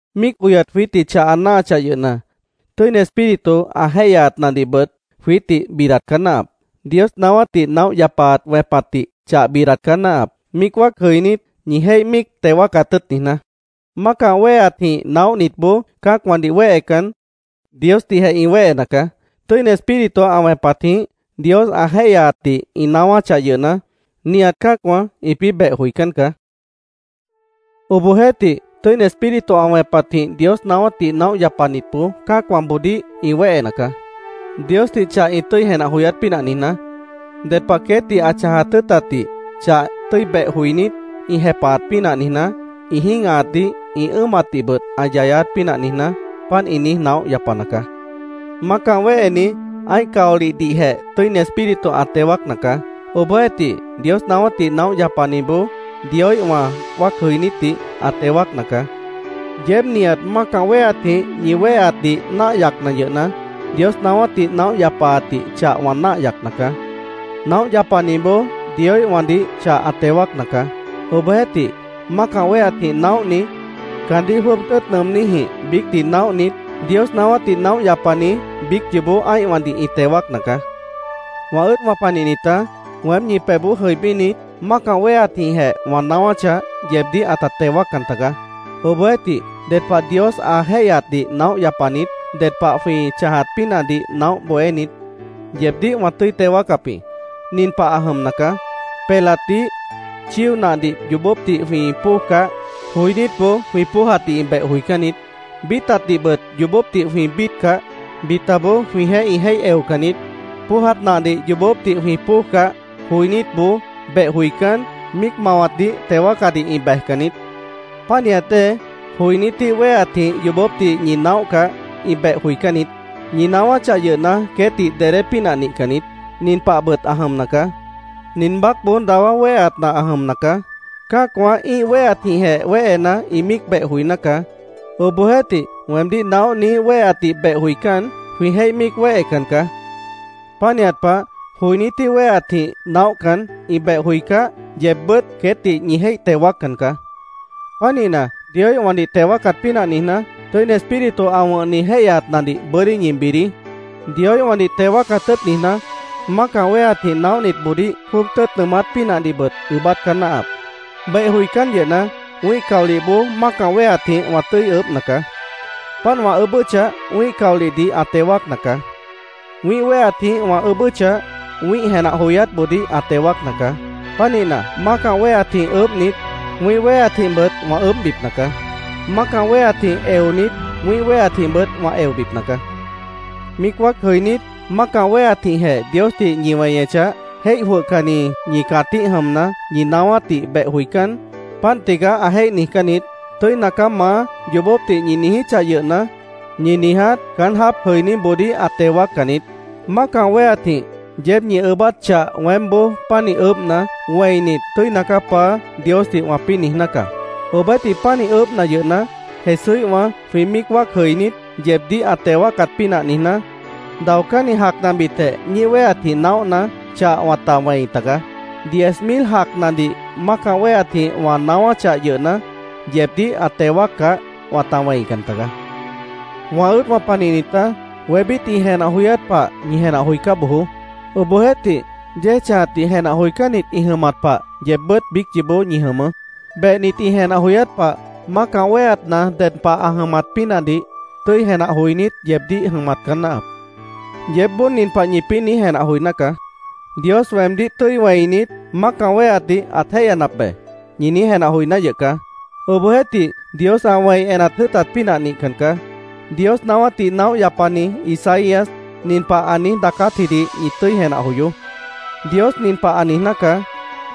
Míic oyat jwiítdih chah ã náahachah yʉhna, Tʉ́ini Espíritu ã jéihyaatnadihbʉt jwiítdih bidat caá náahap. Dios naáwátdih naóh yapaat wẽpatdih chah bidat caá náahap, míic wáac jʉinít, ñi jéih míic teo wáacat tʉ́ʉt niijná. Mácah wéheatjĩh naóhnitboó cã́acwãdih wéhecan, Diosdihjeh ĩ wéhena caá. Tʉ́ini Espíritu ã wẽpatjĩh, Dios ã jéihyaatdih ĩ naáwáchah yʉhna, nihat cã́acwã ĩpĩ́ beh joicán caá. Obohjeéhtih, Tʉ́ini Espíritu ã wẽpatjĩh Dios naáwátdih naóh yapanitboó cã́acwãboodíh ĩ wéhena caá. Diosdih chah ĩ tʉ́i jenah joyát pínah niijná; ded pah queétdih ã chãjat tʉ́ʉtatdih chah tʉ́i beh joinít, ĩ jepahat pínah niijná; ĩ jĩ́gahatdih, ĩ ʉ́ʉmatdihbʉt ã yayát pínah niijná; páant ĩ niíj naóh yapana caá. Mácah wéheni ã́ih caolihdihjeh Tʉ́ini Espíritu ã teo wáacna caá. Obohjeéhtih, Dios naáwátdih naóh yapaniboó Dioíhwã wáac jʉinítdih ã teo wáacna caá. Yeéb nihat mácah wéheatjĩh ñi wéheatdih náah yacna yʉhna, Dios naáwátdih naóh yapaatdih chah wã náah yacna caá. Naóh yapaniboó Dioíhwãdih chah ã teo wáacna caá. Obohjeéhtih, mácah wéheatjĩh naóhni, caandíh jwʉ́ʉb tʉ́ʉt nʉʉmníjĩh biícdih naóhnit, Dios naáwátdih naóh yapani biíc yoobó ã́ihwãdih ĩ teo wáacna caá. Wã ʉ́ʉdwã panihnitá, weém ñi pebhboó jʉibínit, mácah wéheatjĩhjeh wã naáwáchah, yeebdíh ãta teo wáaccan tagaá. Obohjeéhtih, ded pah Dios ã jéihyaatdih naóh yapanit, ded pah jwĩ chãjat pínahdih naóh bohénit, yeebdíh wã tʉ́i teo wáacap jĩ. Nin pah ã jʉmna caá: Pelatdih, chío nahdih yoobópdih jwĩ póojcah, joinítboó jwĩ póojatdih ĩ beh joicán niít. Bíitatdihbʉt yoobópdih jwĩ bíitcah, bitaboó jwĩjeéh ĩ jéih eocan niít. Póojat nahdih yoobópdih jwĩ póojcah, joinítboó beh joicán, míic mawatdih teo wáacadih ĩ bejcan niít. Pánihat dée, joinítíh wéheatjĩh yoobópdih ñi naóhcah, ĩ beh joicán niít. Ñi naáwáchah yʉhna, queétdih dedé pínah nihcan niít. Nin pahbʉt ã jʉmna caá: Nin baácboó dawá wéheatna ã jʉmna caá. Cã́acwã ĩ́ih wéheatjĩhjeh wéhena, ĩ míic beh joiná caá. Obohjeéhtih, weemdíh naóhniíh wéheatdih beh joicán, jwĩ jéih míic wéhecan caá. Pánihat pah, joinítíh wéheatjĩh naóhcan, ĩ beh joicáh, yeebbʉ́t queétdih ñi jéih teo wáaccan caá. Pánihna, Dioíhwãdih teo wáacat pínah niijná, Tʉ́ini Espíritu ã wʉ̃hni jéihyaatnadih bʉ́dí ñi bidií. Dioíhwãdih teo wáacat tʉ́ʉt niijná, mácah wéheatjĩh naóhniboodíh jwʉ́ʉb tʉ́ʉt nʉʉmát pínahdihbʉt ʉʉ́bát caá náahap. Beh joicán yʉhna, wĩ́ih caolihboó mácah wéheatjĩh wã tʉ́i ʉʉ́bhna caá. Páant wã ʉʉ́bʉ́chah, wĩ́ih caolihdih ã teo wáacna caá. Wĩ́ih wéheatjĩh wã ʉʉ́bʉ́chah, wĩ́ih jenah joyátboodíh ã teo wáacna caá. Pánihna, mácah wéheatjĩh ʉʉ́bhnit, wĩ́ih wéheatjĩhbʉt wã ʉʉ́bhbipna caá. Mácah wéheatjĩh eonit, wĩ́ih wéheatjĩhbʉt wã eobipna caá. Míic wáac jʉinít, mácah wéheatjĩhjeh Diosdih ñi weñechah, jéih jwʉhcanni ñi cãtíh jʉmna, ñi naáwátdih beh joicán, “Páant tigaá”, ã jéih niijcán niít. “Tʉ́ina caá, Maá”, yoobópdih ñi niijíchah yʉhna, ñi niiját caán jáap jʉiníboodíh ã teo wáaccan niít. Mácah wéheatjĩh yeéb ñi ʉʉ́bát chah weémboó pánih ʉʉ́bhna, wẽinit, “Tʉ́ina caá, Paá”, Diosdih wãpĩ́ niijná caá. Obohjeéhtih, pánih ʉʉ́bhna yʉhna, Jesúíhwã jwĩ míic wáac jʉinít, yeebdíh ã teo wáacat pínah niijná, daocánni jacnabitjeh ñíih wéheatjĩh naóhna, chah wãta wẽi tagaá. Diez mil jacnadih mácah wéheatjĩh wã naáwáchah yʉhna, yeebdíh ã teo wáaccah, wãta wẽican taga. Wã ʉ́ʉdwã panihnitá, wébít ĩ jenah joyát pah ñi jenah joicá bojoó. Obohjeéhtih, yéej chãjatdih jenah joicánnit ĩ jʉmat pah yeebbʉ́t biíc yoobó ñi jʉmʉʉ́. Behnit ĩ jenah joyát pah mácah wéheatna ded pah ã jʉmat pínahdih tʉ́i jenah joinít yeebdíh jʉmat caá náahap. Yeébboó nin pah ñipĩ́ niíj jenah joiná caá: “Dios weemdíh tʉ́i wẽinit, mácah wéheatdih ãt jéihyanap be”, ñi niíj jenah joiná yʉh caá. Obohjeéhtih, Dios ã wẽi enat jʉ́ʉtat pínah nihcan caá. Dios naáwátdih naóh yapani Isaías nin pah ã niíj daacátjidih ñi tʉ́i jenah joyoó: “Dios nin pah ã niijná caá: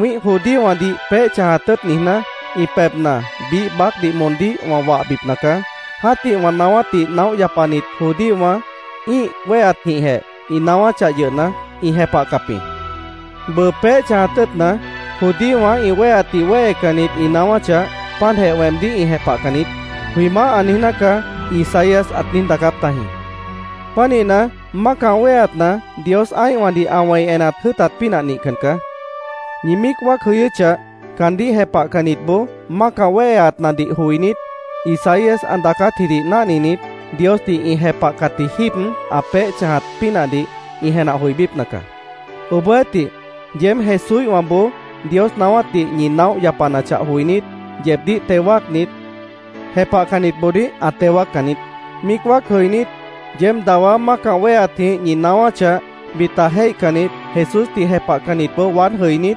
‘Wĩ́ih judíowãdih peéh chãjat tʉ́ʉt niijná, ĩ pebhna biíh baácdih moondíh wã wahbipna caá. Jã́tih wã naáwátdih naóh yapanit judíowã ĩ́ih wéheatjĩhjeh ĩ naáwáchah yʉhna, ĩ jepahcap jĩ. Bʉʉ peéh chãjat tʉ́ʉtna, judíowã ĩ wéheatdih wéhecannit ĩ naáwáchah, páantjeh weemdíh ĩ jepahcan niít’, jwĩ Maáh ã niijná caá”, Isaías ãt niíj daacáp tajĩ. Pánihna, mácah wéheatna Dios ã́ihwãdih ã wẽi enat jʉ́ʉtat pínah nihcan caá. Ñi míic wáac jʉyʉ́chah, caandíh jepahcannitboó mácah wéheatnadih joinít, Isaías ã daacátjidih náhninit, Diosdih ĩ jepahcatji jíib ã peéh chãjat pínahdih ĩ jenah joibípna caá. Obohjeéhtih, yeéb Jesúíhwãboó Dios naáwátdih ñi naóh yapanachah joinít, yeebdíh teo wáacnit, jepahcannitboodíh ã teo wáaccan niít. Míic wáac jʉinít, yeéb dawá mácah wéheatjĩh ñi naáwáchah, bita jéihcannit, Jesúsdih jepahcannitboó waád jʉinít,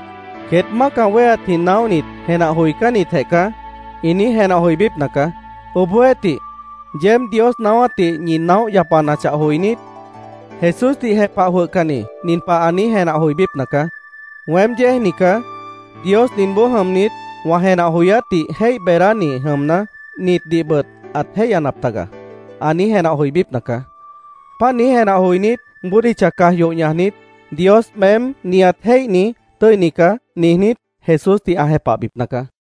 “Queét mácah wéheatjĩh naóhnit jenah joicánnitjeh caá”, ĩ niíj jenah joibípna caá. Obohjeéhtih, yeéb Dios naáwátdih ñi naóh yapanachah joinít, Jesúsdih jepah jwʉhcanni nin pah ã niíj jenah joibípna caá: “Weém yéejni caá. Dios ninboó jʉmnit, wã jenah joyátdih jéih beedáni jʉmna, nitdihbʉt ãt jéihyanap taga”, ã niíj jenah joibípna caá. Páant niíj jenah joinít, bódicha caj yoh ñajnit, “Dios, meém nihat jéihni, tʉ́ini caá”, niijnít, Jesúsdih ã jepahbipna caá.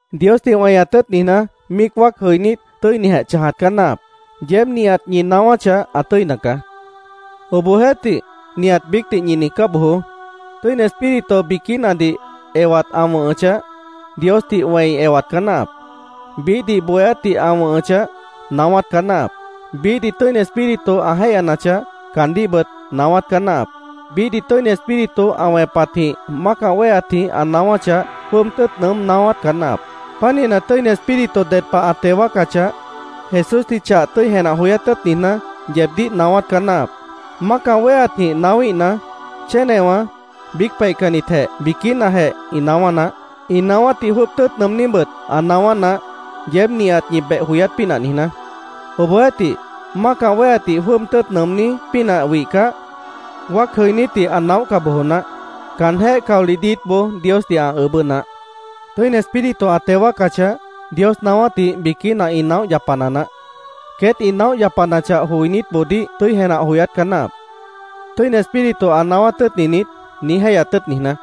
Diosdih weñat tʉ́ʉt niijná, míic wáac jʉinít, tʉ́inijeh chãjat caá náahap. Yeéb nihat ñi naáwáchah, ã tʉ́ina caá. Obohjeéhtih, nihat biícdih ñi niijcá bojoó. Tʉ́ini Espíritu biquínadih ewat ã wʉ̃hʉchah, Diosdih wẽi ewat caá náahap. Biíhdih bohéátdih ã wʉ̃hʉchah, naáwát caá náahap. Biíhdih Tʉ́ini Espíritu ã jéihyanachah, caandíhbʉt naáwát caá náahap. Biíhdih Tʉ́ini Espíritu ã wẽpatjĩh mácah wéheatjĩh ã naáwáchah, jwʉ́ʉb tʉ́ʉt nʉʉ́m naáwát caá náahap. Pánihna, Tʉ́ini Espíritu ded pah ã teo wáacachah, Jesúsdih chah tʉ́i jenah joyát tʉ́ʉt niijná, yeebdíh naáwát caá náahap. Mácah wéheatjĩh naáwíhna, chénewã, biíc peihcannitjeh biquínajeh ĩ naáwá naáh. Ĩ naáwátdih jwʉ́ʉb tʉ́ʉt nʉʉmníbʉt ã naáwá naáh, yeéb nihat ñi beh joyát pínah niijná. Obohjeéhtih, mácah wéheatdih jwʉ́ʉb tʉ́ʉt nʉʉmní pínah wihcah, wáac jʉinítdih ã naóhca bojo naáh. Caanjéh caolih diítboó Diosdih ã ʉʉ́bʉ́ naáh. Tʉ́ini Espíritu ã teo wáacachah, Dios naáwátdih biquína ĩ naóh yapana naáh. Queét ĩ naóh yapanachah, joinítboodíh tʉ́i jenah joyát caá náahap, “¿Tʉ́ini Espíritu ã naáwát tʉ́ʉtni niít?” niíj jéihyat tʉ́ʉt niijná.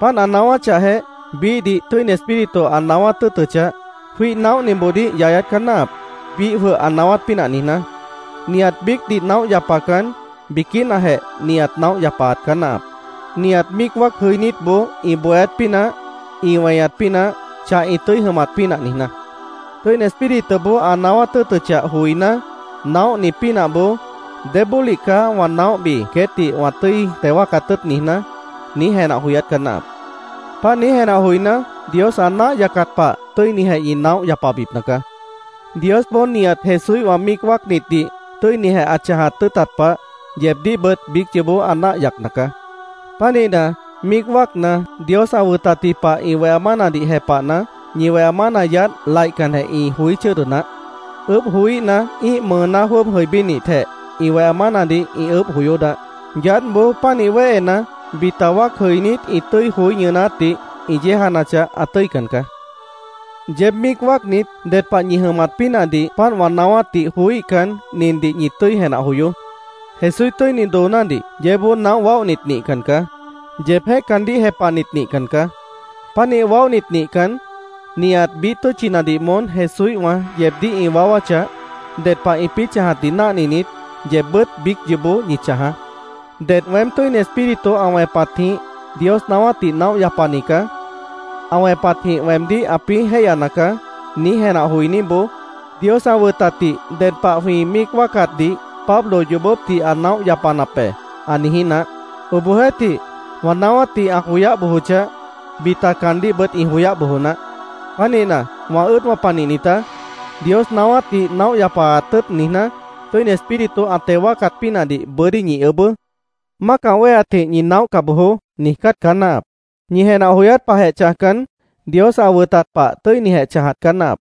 Páant ã naáwáchahjeh, biíhdih Tʉ́ini Espíritu ã naáwát tʉ́ʉtʉchah, jwíih naóhniboodíh yayát caá náahap, biíh jwʉh ã naáwát pínah niijná. Nihat biícdih naóh yapacan, biquínajeh nihat naóh yapaat caá náahap, nihat míic wáac jʉinítboó ĩ bohéát pínah, ĩ weñat pínah, chah ĩ tʉ́i jʉmat pínah niijná. Tʉ́ini Espírituboó ã naáwát tʉ́ʉtʉchah joiná, naóhni pínahboó “¿Débólih caá wã naóhbi, queétdih wã tʉ́i teo wáacat tʉ́ʉt niijná?” niíj jenah joyát caá náahap. Páant niíj jenah joiná, Dios ã náah yacat pah tʉ́inijeh ñi naóh yapabipna caá. Diosboó nihat Jesúíhwã míic wáacnitdih tʉ́inijeh ã chãjat tʉ́ʉtat pah, yeebdíhbʉt biíc yoobó ã náah yacna caá. Pánihna, míic wáacna, Dios ã wʉtatji pah ĩ weha mánadih jepahna, ñi weha mána yaádh laihcanjeh ĩ joí chʉ́ʉdʉ naáh. Ʉʉ́bh joííhna, ĩ́ih mʉʉná jwʉ́ʉb jʉibínitjeh, ĩ weha mánadih ĩ ʉʉ́bh joyó naáh. Yaádhboó pánih wéhena, bita wáac jʉinít ĩ tʉ́i joí ñʉʉnátdih ĩ yéejanachah, ã tʉ́ican caá. Yeéb míic wáacnit, ded pah ñi tʉ́i jʉmat pínahdih páant wã naáwátdih joííhcan, nindih ñi tʉ́i jenah joyoó: Jesúíh tʉ́ini doonádih yeébboó naóh waóhnit nihcan caá. Yeebjéh caandíh jepahnit nihcan caá. Pánih waóhnit nihcan, nihat biíh tʉ́tchinadih moón Jesúíhwã yeebdíh ĩ waáwáchah, ded pah ĩpĩ́ chãjatdih náhninit, yeebbʉ́t biíc yoobó ñi chãjaá. Ded “Weém Tʉ́ini Espíritu ã wẽpatjĩh Dios naáwátdih naóh yapani caá. Ã wẽpatjĩh weemdíh ãpĩ́ jéihyana caá”, niíj jenah joiníboó “Dios ã wʉtatdih ded pah jwĩ míic wáacatdih Pablo yoobópdih ã naóh yapanap be”, ã niijí naáh. Obohjeéhtih, wã naáwátdih ã joyáh bojochah, bita caandíhbʉt ĩ joyáh bojo naáh. Pánihna, wã ʉ́ʉdwã panihnitá, Dios naáwátdih naóh yapaat tʉ́ʉt niijná, Tʉ́ini Espíritu ã teo wáacat pínahdih bʉ́dí ñi ʉʉ́bʉ́. “Mácah wéheatjĩh ñi naóhca bojoó”, niijcát caá náahap. Ñi jenah joyát pahjeh chãjcan, Dios ã wʉtat pah tʉ́inijeh chãjat caá náahap.